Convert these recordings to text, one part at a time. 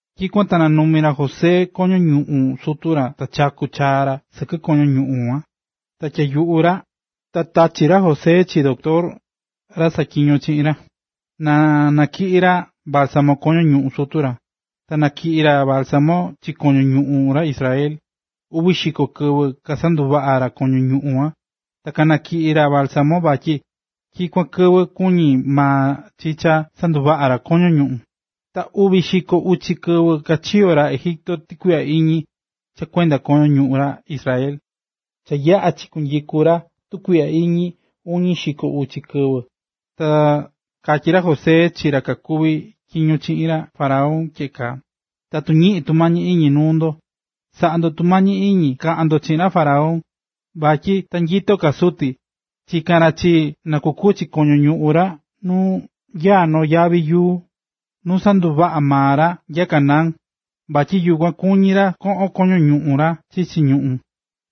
Tyikuan ta nanumi̱ ra José koño ñuꞌún sutu ra ta chaku̱ chaa ra sɨkɨ koño ñuꞌun kuan ra ta tyaa̱ yuꞌu ra. Ta tachi̱ ra José chi doctor, ra kasaꞌatyiñó chiꞌin ra, na natyiꞌi ra bálsamo koño ñuꞌún sutu ra. Ta kanatyiꞌi̱ ra bálsamo chi koño ñuꞌún ra Israel. Uvi xiko kɨvɨ kasanduvaꞌa̱ ra koño ñuꞌún kuan, ta kanatyiꞌi̱ ra bálsamo, vatyi tyikuan kɨvɨ kuñí maa chi cha sanduvaꞌa ra noo koño ñuꞌún. Ta uñi xiko uchi kɨvɨ kachiyo̱ ra Egipto tukuiꞌya iñi cha kuenda koño ñuꞌún ra Israel. Cha yaꞌa̱ cha chinyiku̱ ra tukuiꞌya iñi uñi xiko uchi kɨvɨ, ta katyí ra José chi ra kakuví tyiño chiꞌin ra faraón tyeꞌe kaa: ―Tatu ñiꞌín tumañi iñi nuu ndo, sa̱ꞌa ndo tumañi iñi ka̱ꞌan ndo chiꞌin ra faraón. Vatyi ta nyito ka suti, chika̱n ra chii, na kukuchi koño ñuꞌún ra nu nyaá noo yavi yuu nu sanduvaꞌa̱ maa ra nya Canaán. Vatyi yukuan kuñí ra koꞌon koño ñuꞌún ra chichi ñuꞌún.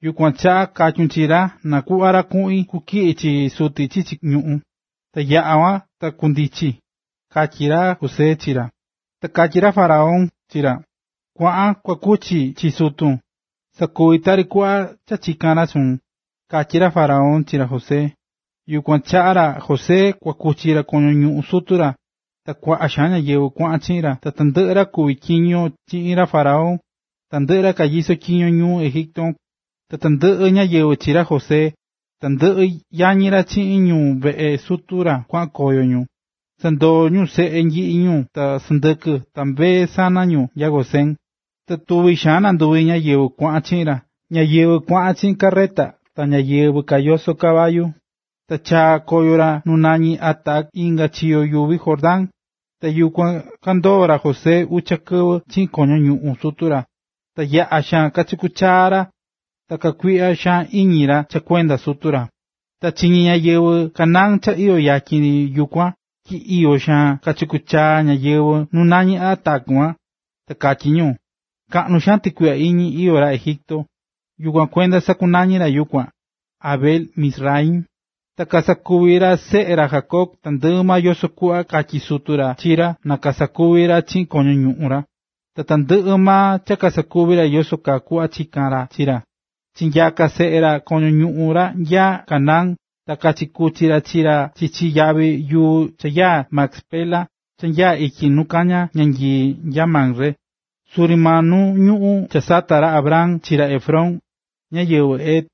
Yukuan chaꞌa katyun chi ra na kuꞌva ra kuꞌin kutyiꞌi chi suti chichi ñuꞌún, ta yaꞌa kuan ta kundichi ―katyí ra José chi ra. Ta katyí ra faraón chi ra: ―Kua̱ꞌan kua kuchi chi sutun, sa̱kuvi tari kuꞌva cha chika̱n ra chuun ―katyí ra faraón chi ra José. Yukuan ta kuaꞌan ra José kua kuchi ra koño ñuꞌún sutu ra, ta kuaꞌa xaan ñáyɨvɨ kuaꞌan chiꞌin ra, tandɨꞌɨ ra kuví tyiño chiꞌin ra faraón, tandɨꞌɨ ra kanyisó tyiño ñuu Egipto kuan, tandɨꞌɨ ñáyɨvɨ chi ra José, tandɨꞌɨ yañi ra chiꞌin ñu veꞌe sutu ra kuaꞌan koyo ñu, sandoo̱ ñu seꞌe nyiꞌi ñu ta sɨndɨkɨ ta mbee sana ñu nya Gosén. Ta tuvi xaan nanduvi ñáyɨvɨ kuaꞌan chiꞌin ra, ñáyɨvɨ kuaꞌan chiꞌin carreta ta ñáyɨvɨ kayosó caballu.a Ta chaa̱ koyo ra nu nañí Atad inga chiyo yuvi Jordán, ta yukuan kandoo̱ ra José ucha kɨvɨ chiꞌin koño ñuꞌún sutu ra, ta yaꞌa̱ xaan cha kachaku̱ chaa ra ta kakuiꞌya xaan iñi ra cha kuenda sutu ra. Cha chiñi̱ ñáyɨvɨ Canaán cha iyó yatyin ri yukuan tyi iyo xaan kachakú chaa ñáyɨvɨ nu nañí Atad kuan, ta katyí ñu: “Kaꞌnu xaan tɨkuiꞌya iñi iyó ra Egipto.” Yukuan kuenda sakunañi̱ ra yukuan, Abel-mizraim. Ta kasakuvi̱ ra seꞌe ra Jacob tandɨꞌɨ maa yoso kuꞌva katyí sutu ra chi ra na kasakuvi ra chiꞌin koño ñuꞌún ra. Ta tandɨꞌɨ maa ta kasakuvi̱ ra yoso kuꞌva chika̱n ra chi ra. Chinyaka̱ seꞌe ra koño ñuꞌún ra nya Canaán ta kachikuchi̱ ra chi ra chichi yavi yuu cha nyaá Macpela cha nyaá ityi nu kañá ñanyii nya Mamre, suri maa nu ñuꞌún cha sata̱ ra Abraham chi ra Efrón, ñáyɨvɨ Het,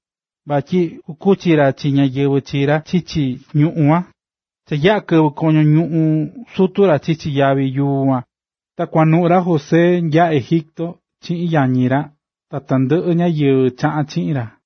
vatyi kukuchi ra chi ñáyɨvɨ chi ra chichi ñuꞌún kuan. Cha yaꞌa̱ tyiꞌi̱ ra koño ñuꞌún sutu ra chichi yavi yuu kuan, ta kuanuꞌu̱ ra José nya Egipto chiꞌin yañi ra ta tandɨꞌɨ ñáyɨvɨ chaꞌa̱n chiꞌin ra.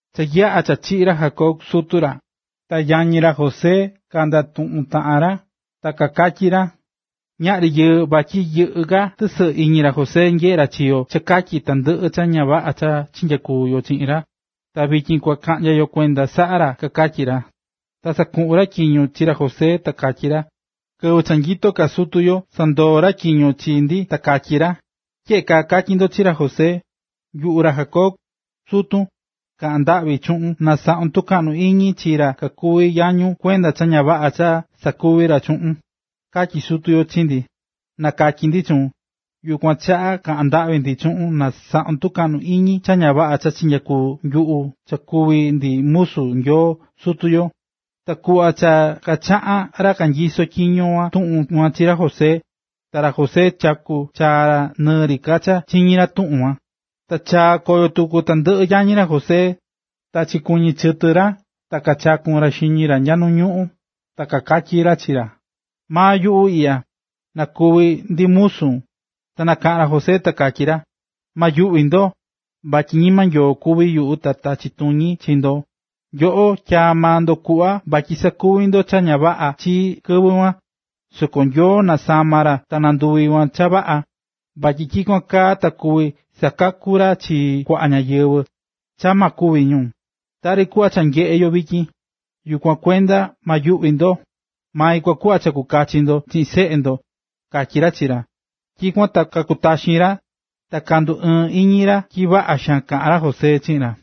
Cha yaꞌa̱ cha chiꞌi̱ ra Jacob, sutu ra, ta yañi ra José kandatuꞌún taꞌan ra ta kakatyí ra: “Ñaꞌri yɨɨ vatyi yɨꞌɨ́ ka tɨsɨꞌɨ iñi ra José nyeꞌé ra chi yo cha katyi tandɨꞌɨ cha ña vaꞌa cha chinyakuvi̱ yo chiꞌin ra, ta vityin kua kaꞌnya yo kuenda saꞌa ra”, kakatyí ra. Ta kasakuꞌu̱n ra tyiño chi ra José ta katyí ra: “Kɨvɨ cha nyitó ka sutu yo, sandoo̱ ra tyiño chi ndi ta katyí ra: Tyeꞌe kaa katyí ndo chi ra José: ‘Yuꞌu ra Jacob, sutun, ka̱ꞌan ndaꞌvi chuꞌun na saꞌun tukaꞌnu iñi chi ra kakuví yañun kuenda cha ña vaꞌa cha kasakuvi̱ ra chuꞌun’, katyi̱ sutu yo chi ndi, na katyi ndi chuun. Yukuan chaꞌa kaꞌán ndaꞌvi ndi chuun na saꞌun tɨkaꞌnu iñi cha ña vaꞌa cha chinyakuvi̱ nyuꞌu cha kuví ndi musu Nyoo sutu yo.” Ta kuꞌva cha kachaꞌá ra kanyisó tyiño kuan tuꞌun kuan chi ra José, ta ra José chaku̱ chaa ra nɨɨ ri ka cha chiñí ra tuꞌun kuan. Ta chaa̱ koyo tuku tandɨꞌɨ yañi ra José, ta kachikuɨñɨ̱ chɨtɨ ra ta kachaku̱n ra xiñi ra nya nu ñuꞌún ta kakatyí ra chi ra: ―Maa nyuꞌu iꞌya, na kuvi ndi musun. Ta nakaꞌa̱n ra José ta katyí ra: ―Ma yuꞌvi ndo, vatyi ñima Nyoo kuví yuꞌu ta tachi tuñi chi ndo. Nyoꞌo tyaa̱ maa ndo kuꞌva vatyi sakuvi ndo cha ña vaꞌa chii kɨvɨ kuan. Soko Nyoo nasama̱ ra ta nanduvi̱ kuan cha vaꞌa, vatyi tyikuan kaa ta kuvi sakaku ra chi kuaꞌa ñáyɨvɨ cha ma kúvi ñu, tari kuꞌva cha nyeꞌé yo vityin. Yukuan kuenda ma yuꞌvi ndo; mai kua kuꞌva cha kua kachi ndo chiꞌin seꞌe ndo ―katyí ra chi ra. Tyikuan ta kakutaxi̱n ra ta kanduɨɨ̱n iñi ra tyi vaꞌa xaan kaꞌa̱n ra José chiꞌin ra.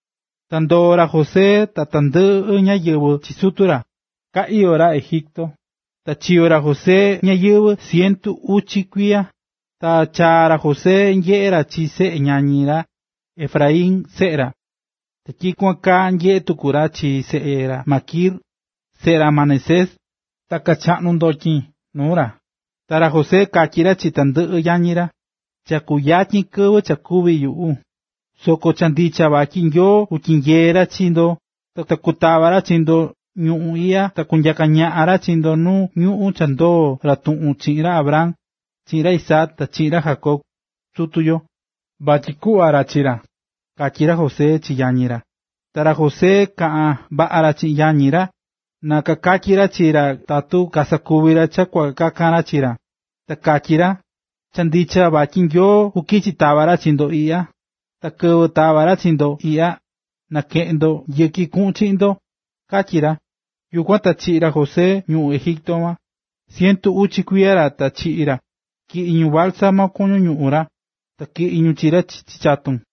Ta ndoo̱ ra José ta tandɨꞌɨ ñáyɨvɨ chi sutu ra, ka iyó ra Egipto. Ta chiyo̱ ra José ñayɨvɨ̱ cientu uchi kuiya. Ta chaa̱ ra José nyeꞌe̱ ra chi seꞌe ñañi ra Efraín, seꞌe ra. Ta tyikuan kaa, nyeꞌé tuku ra chi seꞌe ra Maquir, seꞌe ra Manasés, ta kachaꞌnu̱ ndotyin nuu ra. Ta ra José katyí ra chi tandɨꞌɨ yañi ra: “Cha kuyatyin kɨvɨ cha kúvi yuꞌu, soko cha ndicha vatyi Nyoo kutyinyee ra chi ndo ta kutava ra chi ndo ñuu iꞌya ta kunyaka ra chi ndo nu ñuꞌún cha ndoo̱ ra tuꞌun chiꞌin ra Abraham, chiꞌin ra Isaac ta chiꞌin ra Jacob, sutu yo, vatyi kuꞌva ra chi ra”, katyí ra José chi yañi ra. Ta ra José kaꞌa̱n vaꞌa ra chiꞌin yañi ra, na kakatyi ra chi ra tatu kasakuvi ra cha kua kakan ra chi ra, ta katyí ra: “Cha ndicha vatyi Nyoo kukichi tava ra chi ndo iꞌya, ta kɨvɨ tava ra chi ndo iꞌya, nakeꞌen ndo yɨki kuꞌun chiꞌin ndo”, katyí ra. Yukuan ta chiꞌi̱ ra José ñuꞌún Egipto kuan. Cientu uchi kuiya ra ta chiꞌi̱ ra, ta tyiꞌi̱ ñu bálsamo koño ñuꞌún ra, ta tyiꞌi̱ ñu chi ra chichi chatun.